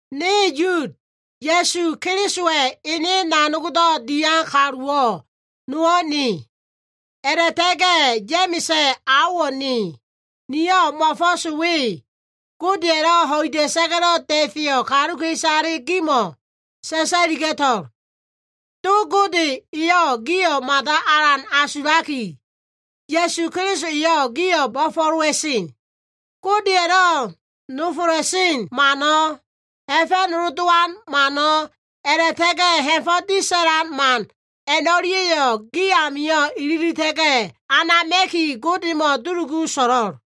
Ne Yud, Ya꞉su Kelisowa꞉ ene nanogdo꞉ dian kaluwo꞉ nowo꞉ ne. A꞉la꞉ta꞉ga꞉ Ya꞉ma꞉sa꞉ aowo꞉ ne. Niyo꞉ mo꞉fo꞉s we Godeya꞉lo꞉ ho꞉ida꞉sa꞉ga꞉lo꞉ da꞉feyo꞉ kaluka꞉isale gimo꞉ sa꞉sa꞉liga꞉to꞉l. Do Gode eyo꞉ gio꞉ mada alan asulaki, Ya꞉su Keliso eyo꞉ gio꞉ bo꞉fo꞉lowa꞉sen. Godeya꞉lo꞉ nofola꞉sen mano꞉, ha꞉fa꞉nolo dowan mano꞉, a꞉la꞉ta꞉ga꞉ ha꞉fo꞉ disa꞉la꞉sen man a꞉no꞉lia꞉yo꞉ gi amio꞉ ililita꞉ga꞉ anama꞉ki, Godemo꞉ dulugu so꞉lo꞉l.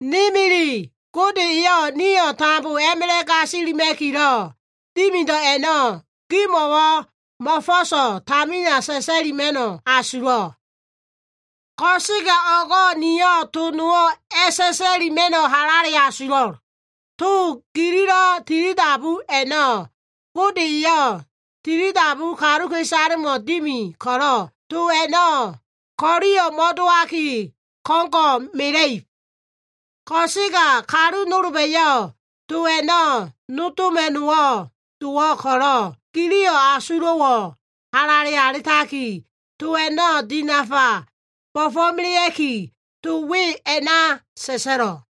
Ne milile, Gode eyo꞉ nio꞉ tambo a꞉ma꞉la꞉ gasilima꞉kilo꞉ dimido꞉ a꞉no꞉ gimo꞉wo꞉ mo꞉fo꞉so꞉ tamina sa꞉sa꞉lima꞉no꞉ asulo꞉. Ko꞉sega o꞉go꞉ niyo꞉ to nowo꞉ halale a꞉sa꞉sa꞉lima꞉no꞉ asulo꞉. To gililo꞉ tilidabu a꞉no꞉ Gode eyo꞉ tilidabu kaluka꞉isalemo꞉ dimi ko꞉lo꞉, to a꞉no꞉ ko꞉liyo꞉ mo꞉dowaki, ko꞉ngo꞉ mela꞉ib. Ko꞉sega kalu nolba꞉yo꞉ to a꞉no꞉ nodoma꞉no꞉ dowo꞉ ko꞉lo꞉ gili asulo꞉wo꞉ halale alitaki, to a꞉no꞉ dinafa bo꞉fo꞉melea꞉ki, to we a꞉na sa꞉sa꞉lo꞉l.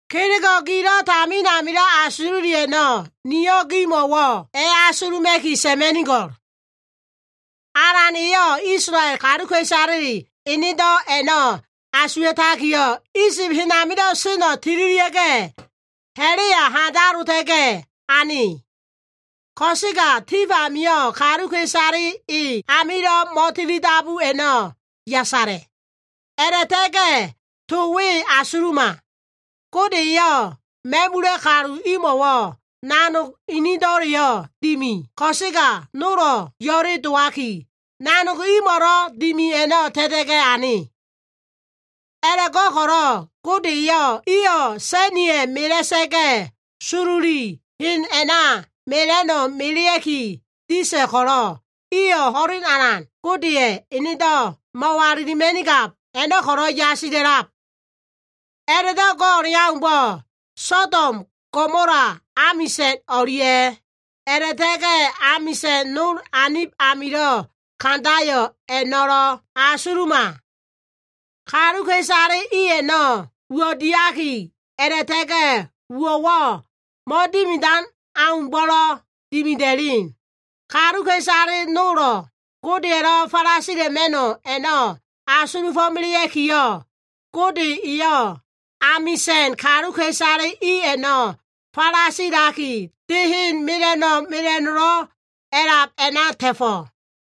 Kelego꞉ gilo꞉ tamin amilo꞉ asululi a꞉no꞉ niyo꞉ gimo꞉wo꞉ a꞉asuluma꞉ki sa꞉ma꞉nigo꞉l. Alan eyo꞉ Isolael kaluka꞉isale enedo꞉ a꞉no꞉ asuwa꞉takiyo꞉, Isib hen amilo꞉ seno꞉ tililia꞉ga꞉, ha꞉la꞉ya handalota꞉ga꞉ ane. Ko꞉sega tif amio꞉ kaluka꞉isale e amilo꞉ mo꞉tilidabu a꞉no꞉ yasala꞉. A꞉la꞉ta꞉ga꞉ to we asuluma. Gode eyo꞉ ma꞉mula꞉ kalu imo꞉wo꞉ nanog inido꞉leyo꞉ dimi ko꞉sega, nolo꞉ yo꞉le dowaki, nanog imo꞉lo꞉ dimi a꞉no꞉ ta꞉ta꞉ga꞉ ane. A꞉la꞉go꞉ko꞉lo꞉ Gode eyo꞉ iyo꞉ sa꞉niya꞉ mela꞉sa꞉ga꞉, sololi hen a꞉na mela꞉no꞉ melea꞉ki disa꞉ ko꞉lo꞉, iyo꞉ ho꞉len alan Godeya꞉ enedo꞉ mo꞉walilima꞉nigab a꞉no꞉ ko꞉lo꞉ yasila꞉lab. A꞉la꞉do꞉ go꞉ o꞉leaumbo꞉, Sodom, Gomola amisa꞉n o꞉lia꞉yo꞉ a꞉la꞉ta꞉ga꞉ amisa꞉n nol anib amilo꞉ kandayo꞉ a꞉no꞉ asuluma. Kaluka꞉isale i a꞉no꞉ uwo꞉ diaki, a꞉la꞉ta꞉ga꞉ uwo꞉wo꞉ mo꞉dimidan aumbo꞉lo꞉ dimida꞉len. Kaluka꞉isale nolo꞉ Godeya꞉lo꞉ falasila꞉ma꞉no꞉ a꞉no꞉ asulufo꞉melea꞉kiyo꞉, Gode eyo꞉ amisa꞉n kaluka꞉isale i a꞉no꞉ falasilaki, de hen mela꞉no꞉ mela꞉no꞉lo꞉ a꞉lab a꞉na ta꞉fo꞉.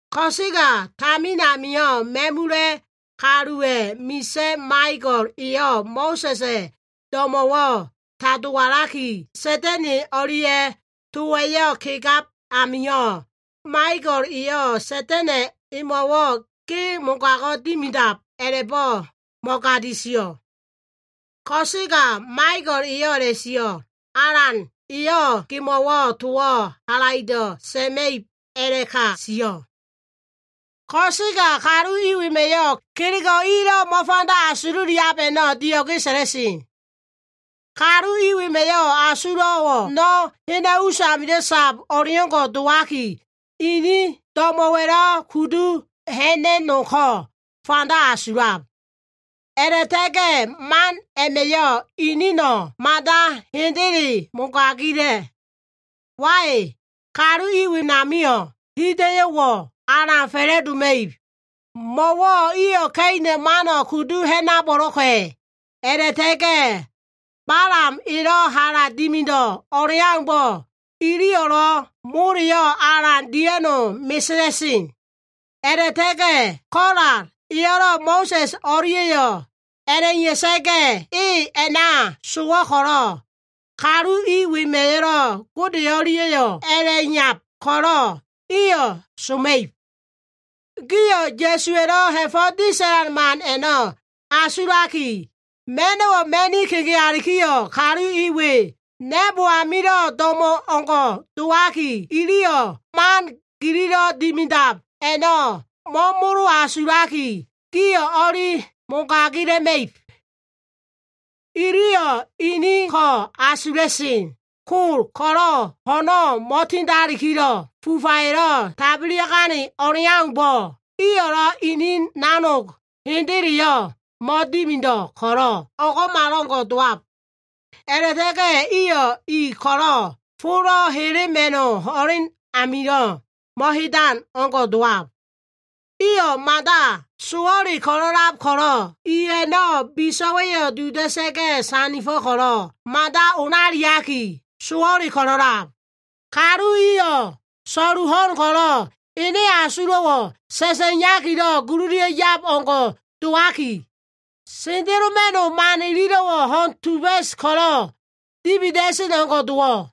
Ko꞉sega tamin amio꞉ ma꞉mula꞉ kaluwa꞉ misa꞉ Maiko꞉l eyo꞉ Mo꞉sa꞉sa꞉ do꞉mo꞉wo꞉ tadowo꞉laki, Sa꞉da꞉na꞉ o꞉lia꞉ towa꞉yo꞉ kegab amio꞉, Maiko꞉l eyo꞉ Sa꞉da꞉na꞉ emo꞉wo꞉, “Ge mogago꞉ dimidab” a꞉la꞉bo꞉ mo꞉gadi sio꞉. Ko꞉sega Maiko꞉l eyo꞉ a꞉la꞉sio꞉, “Alan, eyo꞉ gemo꞉wo꞉ towo꞉ halaido꞉ sa꞉ma꞉ib” a꞉la꞉ka sio꞉. Ko꞉sega kalu i wema꞉yo꞉ kelego꞉ ilo꞉ mo꞉fanda asululiab a꞉no꞉ dio꞉ge sa꞉la꞉sen. Kalu i wema꞉yo꞉ asulo꞉wo꞉ no꞉ hena꞉ usamilo꞉ sab o꞉leo꞉ngo꞉ dowaki, inin do꞉mo꞉wa꞉lo꞉ kudu ha꞉na꞉no꞉ko꞉ fanda asulab. A꞉la꞉ta꞉ga꞉ man a꞉ma꞉yo꞉ inino꞉ mada hendele mogagila꞉. Wai! Kalu i wenamio꞉ hida꞉yo꞉wo꞉ alan fa꞉la꞉doma꞉ib. Mo꞉wo꞉ iyo꞉ Ka꞉ina꞉ mano꞉ kudu ha꞉nabo꞉lo꞉ka꞉. A꞉la꞉ta꞉ga꞉ Balam elo꞉ hala dimido꞉ o꞉leaumbo꞉, iliyo꞉lo꞉ moleyo꞉ alan dia꞉no꞉ mesela꞉sen. A꞉la꞉ta꞉ga꞉ Kola eyo꞉ Mo꞉sa꞉s o꞉lia꞉yo꞉ a꞉la꞉iya꞉sa꞉ga꞉, e a꞉na sowo꞉ ko꞉lo꞉, kalu i wema꞉yo꞉lo꞉ Gode o꞉lia꞉yo꞉ a꞉la꞉iyab ko꞉lo꞉ iyo꞉ soma꞉ib. Gio꞉ Ya꞉suwa꞉lo꞉ ha꞉fo꞉ disa꞉la꞉sen man a꞉no꞉ asulaki, ma꞉no꞉wo꞉ ma꞉ni kegea꞉likiyo꞉, kalu i we na꞉bo amilo꞉ do꞉mo o꞉ngo꞉ dowaki, iliyo꞉ man gililo꞉ dimidab a꞉no꞉ mo꞉molo asulaki, gio꞉ o꞉li mogagila꞉ma꞉ib. Iliyo꞉ ini ko꞉ asula꞉sen. Kol ko꞉lo꞉ ho꞉no꞉ mo꞉tindakilo꞉ fufaya꞉lo꞉ tabelia꞉gane o꞉leaumbo꞉, iyo꞉lo꞉ inin nanog hendeleyo꞉ mo꞉dimido꞉ ko꞉lo꞉, o꞉ngo꞉malo꞉ngo꞉ dowab. A꞉la꞉ta꞉ga꞉ iyo꞉ i ko꞉lo꞉ folo꞉ helema꞉no꞉ ho꞉len amilo꞉ mo꞉hedan o꞉ngo꞉ dowo꞉. Iyo꞉ mada sowo꞉le ko꞉lo꞉lab ko꞉lo꞉, i a꞉no꞉ biso꞉wa꞉yo꞉ duda꞉sa꞉ga꞉ sandifo꞉ ko꞉lo꞉, mada olaliaki, sowo꞉le ko꞉lo꞉lab. Kalu iyo꞉ so꞉lu ho꞉n ko꞉lo꞉ ene asulo꞉ sa꞉sa꞉yakilo꞉ gululia꞉yab o꞉ngo꞉ dowaki, sendeloma꞉no꞉ man ililo꞉wo꞉ ho꞉n tuba꞉s ko꞉lo꞉ dibida꞉sen o꞉ngo꞉ dowo꞉.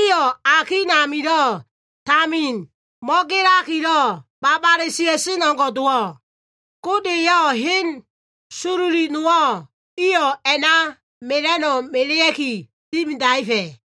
Iyo꞉ akin amilo꞉ tamin mo꞉gelakilo꞉ babale sia꞉sen o꞉ngo꞉ dowo꞉. Gode eyo꞉ hen sololi nowo꞉ iyo꞉ a꞉na mela꞉no꞉ melea꞉ki dimidaefa꞉.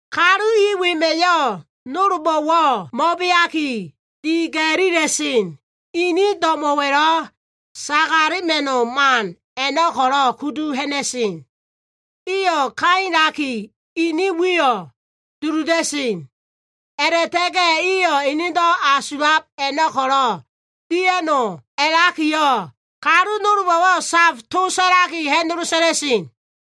Kalu i wema꞉yo꞉ nolbo꞉wo꞉ mo꞉beaki, diga꞉lila꞉sen. Inin do꞉mo꞉wa꞉lo꞉ sagalema꞉no꞉ man a꞉no꞉ ko꞉lo꞉ kudu ha꞉na꞉sen. Iyo꞉ kailaki, inin wiyo꞉ duluda꞉sen. A꞉la꞉ta꞉ga꞉ iyo꞉ enedo꞉ asulab a꞉no꞉ ko꞉lo꞉ dia꞉no꞉ a꞉lakiyo꞉, kalu nolbo꞉wo꞉ safa꞉ to sa꞉lakiyo꞉, ha꞉nolo sa꞉la꞉sen.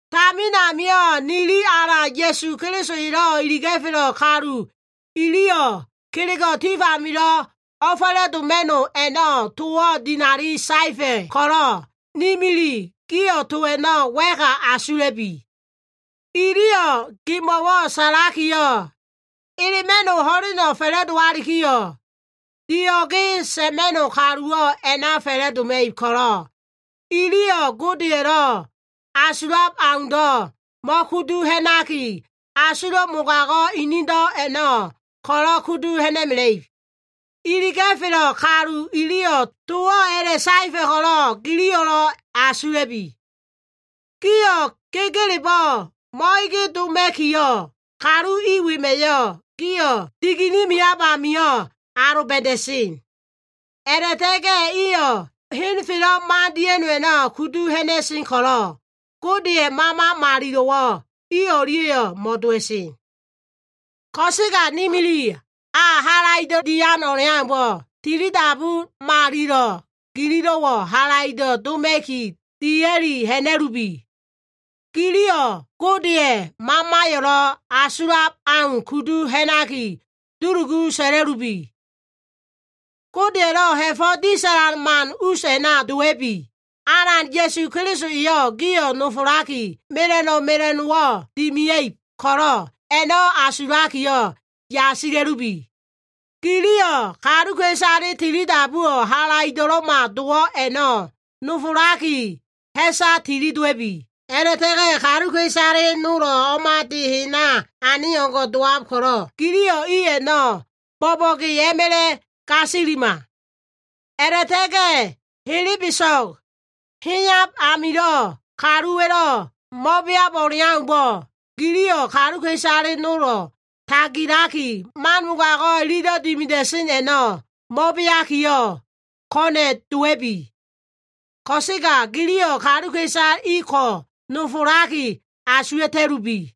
Tamin amio꞉ nili Alan Ya꞉su Keliso elo꞉ iliga꞉felo꞉ kalu iliyo꞉, kelego꞉ tif amilo꞉ o꞉fa꞉la꞉doma꞉no꞉ a꞉no꞉ towo꞉ dinali saefa꞉ ko꞉lo꞉, ni milile gio꞉ to a꞉no꞉ wa꞉ka asula꞉bi. Iliyo꞉ gimo꞉ sa꞉lakiyo꞉, “Elema꞉no꞉ ho꞉leno꞉ fa꞉la꞉dowalikiyo꞉, dio꞉ge sa꞉ma꞉no꞉ kaluwo꞉ a꞉na fa꞉la꞉doma꞉ib ko꞉lo꞉, iliyo꞉ Godeya꞉lo꞉ asulab aundo꞉ mo꞉kudu ha꞉naki, asulo꞉ mogago꞉ inido꞉ a꞉no꞉ ko꞉lo꞉ kudu ha꞉na꞉ib.” Iliga꞉felo꞉ kalu iliyo꞉ towo꞉ a꞉la꞉saefa꞉ ko꞉lo꞉ giliyo꞉ asula꞉bi. Gio꞉ gegelebo꞉ mo꞉ege doma꞉kiyo꞉, kalu i wema꞉yo꞉ gio꞉ digene meab amio꞉ aloba꞉da꞉sen. A꞉la꞉ta꞉ga꞉ iyo꞉ henfelo꞉ mande a꞉no꞉ kudu ha꞉na꞉sen ko꞉lo꞉, Godeya꞉ Mama Malilo꞉wo꞉ i o꞉lia꞉yo꞉ mo꞉dowa꞉sen. Ko꞉sega ni milile, a halaido꞉ dian o꞉leaumbo꞉, tilidabu malilo꞉ gililo꞉wo꞉ halaido꞉ doma꞉ki, dia꞉li ha꞉na꞉lubi. Giliyo꞉ Godeya꞉ Mamaya꞉lo꞉ asulab au kudu ha꞉naki dulugu sa꞉la꞉lubi. Godeya꞉lo꞉ ha꞉fo꞉ disa꞉lan man us a꞉na dowa꞉bi. Alan Ya꞉su Keliso eyo꞉ gio꞉ nofolaki, mela꞉no꞉ mela꞉no꞉wo꞉ dimia꞉ib ko꞉lo꞉, a꞉no꞉ asulakiyo꞉ yasila꞉lubi. Giliyo꞉ kaluka꞉isale tilidabuwo꞉ halaido꞉lo꞉ma dowab a꞉no꞉ nofolaki, ha꞉sa tililia꞉bi. A꞉la꞉ta꞉ga꞉ kaluka꞉isale nolo꞉ o꞉ma de hena ane o꞉ngo꞉ dowab ko꞉lo꞉, giliyo꞉ i a꞉no꞉ bo꞉bo꞉ge a꞉ma꞉la꞉ gasilima. A꞉la꞉ta꞉ga꞉ helebeso꞉g heyab amilo꞉ kaluwa꞉lo꞉ mo꞉beab o꞉leaumbo꞉, giliyo꞉ kaluka꞉isale nolo꞉ tagilaki, man mogago꞉ ilido꞉ dimida꞉sen a꞉no꞉ mo꞉beakiyo꞉ ko꞉na꞉ dowa꞉bi. Ko꞉sega giliyo꞉ kaluka꞉isale i ko꞉ nofolaki asuwa꞉ta꞉lubi.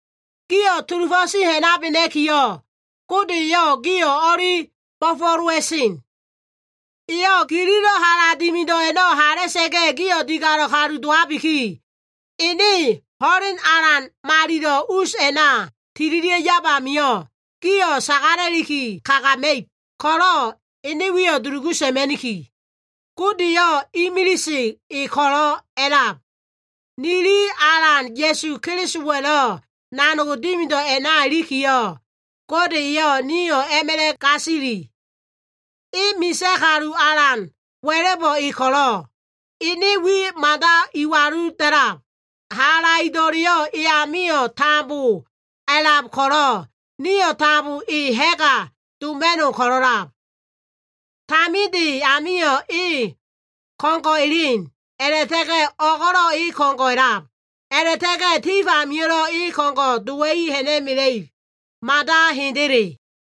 Gio꞉ sulufo꞉ ti ha꞉nabena꞉kiyo꞉, Gode eyo꞉ gio꞉ o꞉li bo꞉fo꞉lowa꞉sen. Eyo꞉ gililo꞉ hala dimido꞉ a꞉no꞉ hala꞉sa꞉ga꞉yo꞉, gio꞉ digalo꞉ kalu dowabiki, ene ho꞉len alan malilo꞉ us a꞉na tililia꞉ yab amio꞉, gio꞉ sagala꞉liki kagama꞉ib ko꞉lo꞉, ene wiyo꞉ dulugu sa꞉ma꞉niki. Godeyo꞉ imilise e ko꞉lo꞉ a꞉lab. Nili Alan Ya꞉su Kelisowa꞉lo꞉ nanog dimido꞉ a꞉na ilikiyo꞉, Gode eyo꞉ nio꞉ a꞉ma꞉la꞉ gasili. E misa꞉ kalu alan wa꞉la꞉bo꞉ e ko꞉lo꞉, ene wiyo꞉ mada iwalu da꞉lab. Halaido꞉leyo꞉ eyamio꞉ tambo a꞉lab ko꞉lo꞉, nio꞉ tambo e ha꞉ga doma꞉no꞉ ko꞉lo꞉lab. Taminde amio꞉ e ko꞉ngo꞉ elen, a꞉la꞉ta꞉ga꞉ o꞉go꞉lo꞉ e ko꞉ngo꞉ a꞉lab, a꞉la꞉ta꞉ga꞉ tif amio꞉lo꞉ e ko꞉ngo꞉ dowa꞉i ha꞉na꞉mela꞉ib. Mada hendele.